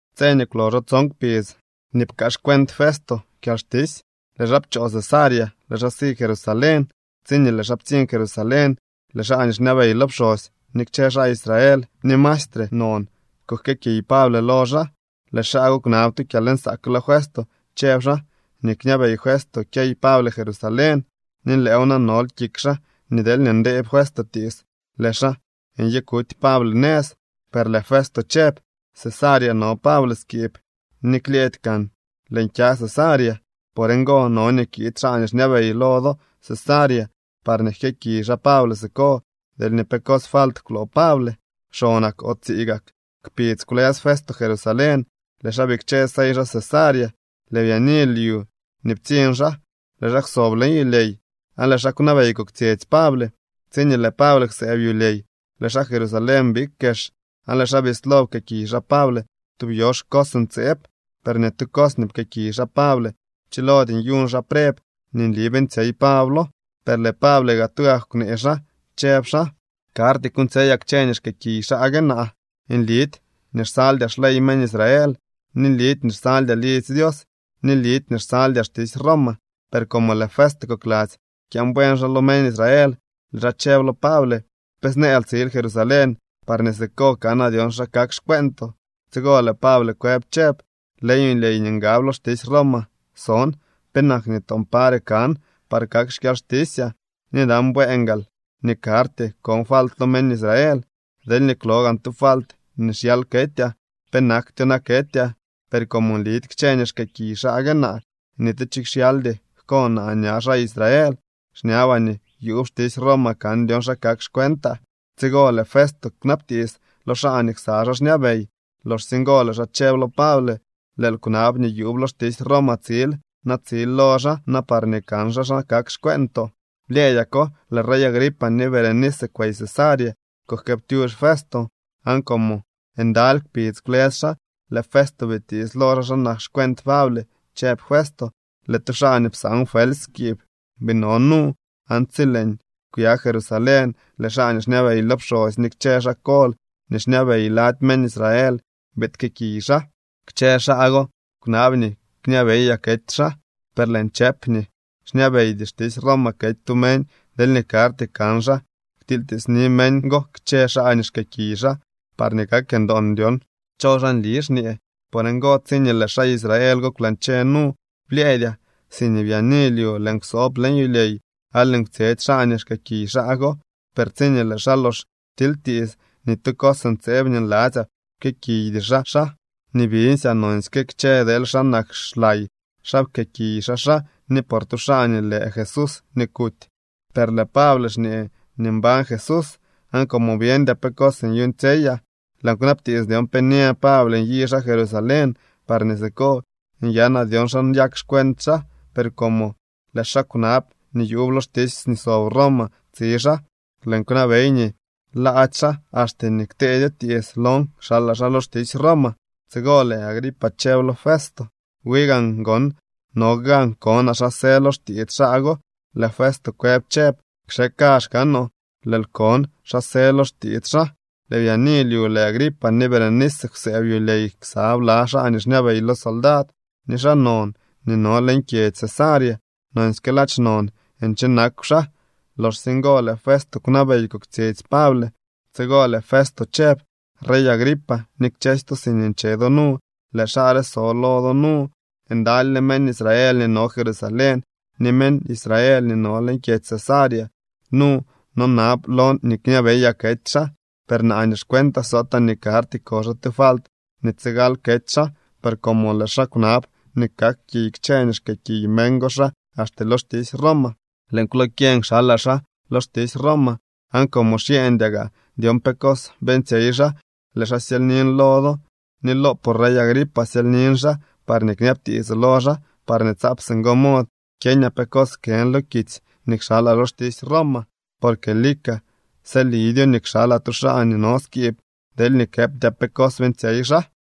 Tse nii kwloxo tson kpidz nii pkaa xcuent Festo kyalxtisy, lëë xaa pchoo Cesarea, lëë xaa si Jerusalén. Tsiñee lëë xaa ptsiñ Jerusalén, lëë xaa nii xñabey lo pxosy ni kchë xaa Israel nii mastre non kujkëëkiy Pable lo xaa. Lëë xaa go kwnab tu kyalnsaak lo Festo chëb xaa nii kñabey Festo kyey Pable Jerusalén. Ni lëëw na nol kik xaa nii deelñee ndee Festo tiits, lëë xaa nyikuty Pable nëz. Per lëë Festo chëb: —Cesarea no Pable skiib ni klyëëdy kaan lëën kya Cesarea. Por ngo no nii kiid xaa nii xñabey lo do Cesarea parñee jkëëkiy xaa Pable siko deelñee pe cos falt kwloo Pable. Xonak o tsii gak kpidz kwlës Festo Jerusalén, lëë xaa bikche sey xaa Cesarea. Lëë byaani lyu nii ptsiñ xaa, lëë xaa kwsob leñ yulyey, aan lëë xaa kwnabey koktsyetsy Pable. Tsiñee lëë Pable kwsëëb yulyey, lëë xaa Jerusalén big kex, aan lëë xaa bislo pkëëkiy xaa Pable tub yox cos ntseeb, per ni tu cos nii pkëëkiy xaa Pable pchilody nyuñ xaa preb nii nli beeñtsyey Pablo. Per lëë Pable gaa tugak kwnee xaa, chëb xaa: —Karty kuuñtsyeyaa kchë nii xkëëkiy xaa gue naa. Nlidy nii xsaldyaa xley meñ Israel, ni nlidy nii xsaldyaa lidzy Dios, ni nlidy nii xsaldyaa xtisy Roma. Per como lëë Festo kokladzy kyaan buen xaa lo meñ Israel, lëë xaa chëb lo Pable: —¿Pe snëël tsil Jerusalén parñee siko kanaa dyon xa kak xcueentoo? Tsigo lëë Pable kwëb chëb: —Leñ yulyey nii ngab lo xtisy Roma son. Penak nii toon pare kan par kak xkyalxtisyaa. Ni nan bueen gaal nii karty kon falt lo meñ Israel. Deelñee kwlo gaan tu falt nii xyal ketyaa, penaktyo na ketyaa. Per como nlidy kchë nii xkëëkiy xaa gue naa, ni tu cho xyaldy jko naa ña xaa Israel. Xñabaa nii yuub xtisy Roma kan dyon xa kak xcuentaa. Tsigo, lëë Festo kwnabtiits lo xaa nii ksa xaa xñabey. Loxsye ngo lëë xaa chëb lo Pable: —Lëël kwnab nii yuub lo xtisy Roma tsil. Na tsil lo xaa na parñee kan xaa xa kak xcueentoo. Blyëëdyako lëë rey Agripa ni Berenice kwey Cesarea kujkëëptyux Festo. Aan como ndaly kpidz kwlës xaa, lëë Festo bitiits lo xaa xa nak xcuent Pable, chëb Festo: —Lëë tu xaa nii psaan Felsy skiib bii no nu. Aan tsi lëën kwya Jerusalén, lëë xaa nii xñabey lo pxosy ni kchë xaa kol nii xñabey lady meñ Israel biid jkëëkiy xaa. Kchë xaa go kwnab nii kñabeyaa kety xaa. Per lëën chëp nii xñabeydy xtisy Roma kety tu meñ deelñee karty kan xaa ktilytiitsni meñ go kchë xaa nii xkëëkiy xaa parñee kak ndoon dyon cho xaa nli xñee. Por ngo, tsiñee lëë xaa Israel go kwlañche nu, blyëëdyaa. Siñee byaani lyu lëën kwsoob leñ yulyey aan lëën kwtsyetsy xaa nii xkëëkiy xaa go. Per tsiñee lëë xaa lox ptilytiits, ni tu cos ntseeb nii nladzyaa pkëëkiydy xaa xaa. Nii biñsyaa nonsyke kchë deel xa nak xlay xaa pkëëkiy xaa xaa ni por tu xaa nii lë Jesús nii kuty, per lëë Pable xñee nii mbañ Jesús. Aan como byeñdyaa pe nyuuñtsyeyaa, lëën kwnabtiits dyon pe nyë Pable nyi xaa Jerusalén parñee siko nyanaa dyon xa nyak xcuent xaa. Per como lëë xaa kwnab nii yuub lo xtisy nii sob Roma tsi xaa, lëën kwnabey nii laady xaa axte nii kteedyo tiits lon kxalaa xaa lo xtisy Roma. Tsigo lëë Agripa chëb lo Festo: —Wi gaan gon no gan konaa xa së lo xtiits xaa go. Lëë Festo kwëb chëb: —Kxe kazh kaanoo, lëël kon xa së lo xtiits xaa. Lëë byaani lyu, lëë Agripa ni Berenice kwsëëb yulyey ksa bla xaa nii xñabey lo soldad ni xaa non nii no leñ kyedzy Cesarea. Nonsyke ladx non nche nakw xaa. Loxsye ngo lëë Festo kwnabey koktsyetsy Pable. Tsigo lëë Festo chëb: —Rey Agripa ni kchësy to siñee nche do nu, lëë xaa re so lo do nu. Ndalyle meñ Israel nii no Jerusalén ni meñ Israel nii no leñ kyedzy Cesarea nu nonab lon nii kñabeyaa kety xaa. Per naa nii xcuentaa sootaa nii karty ko xaa tu falt nii tsigal kety xaa, per como lëë xaa kwnab nii kak kiy kchë nii xkëëkiy meñ go xaa axte lo xtisy Roma, lëën kwlokyeñ kxalaa xaa lo xtisy Roma. Aan como xyeñdyaa gaa dyon pe cos beeñtsyey xaa, lëë xaa syelynin lo do, ni loopoo rey Agripa syelynin xaa parñee kñabtiitsoo lo xaa parñee tsaap singo mod kyeñaa pe cos jkën lo kitsy nii kxalaa lo xtisy Roma. Porque lika sëlidyo nii kxalaa tu xaa nii no skiib, deelñee këptyaa pe cos beeñtsyey xaa.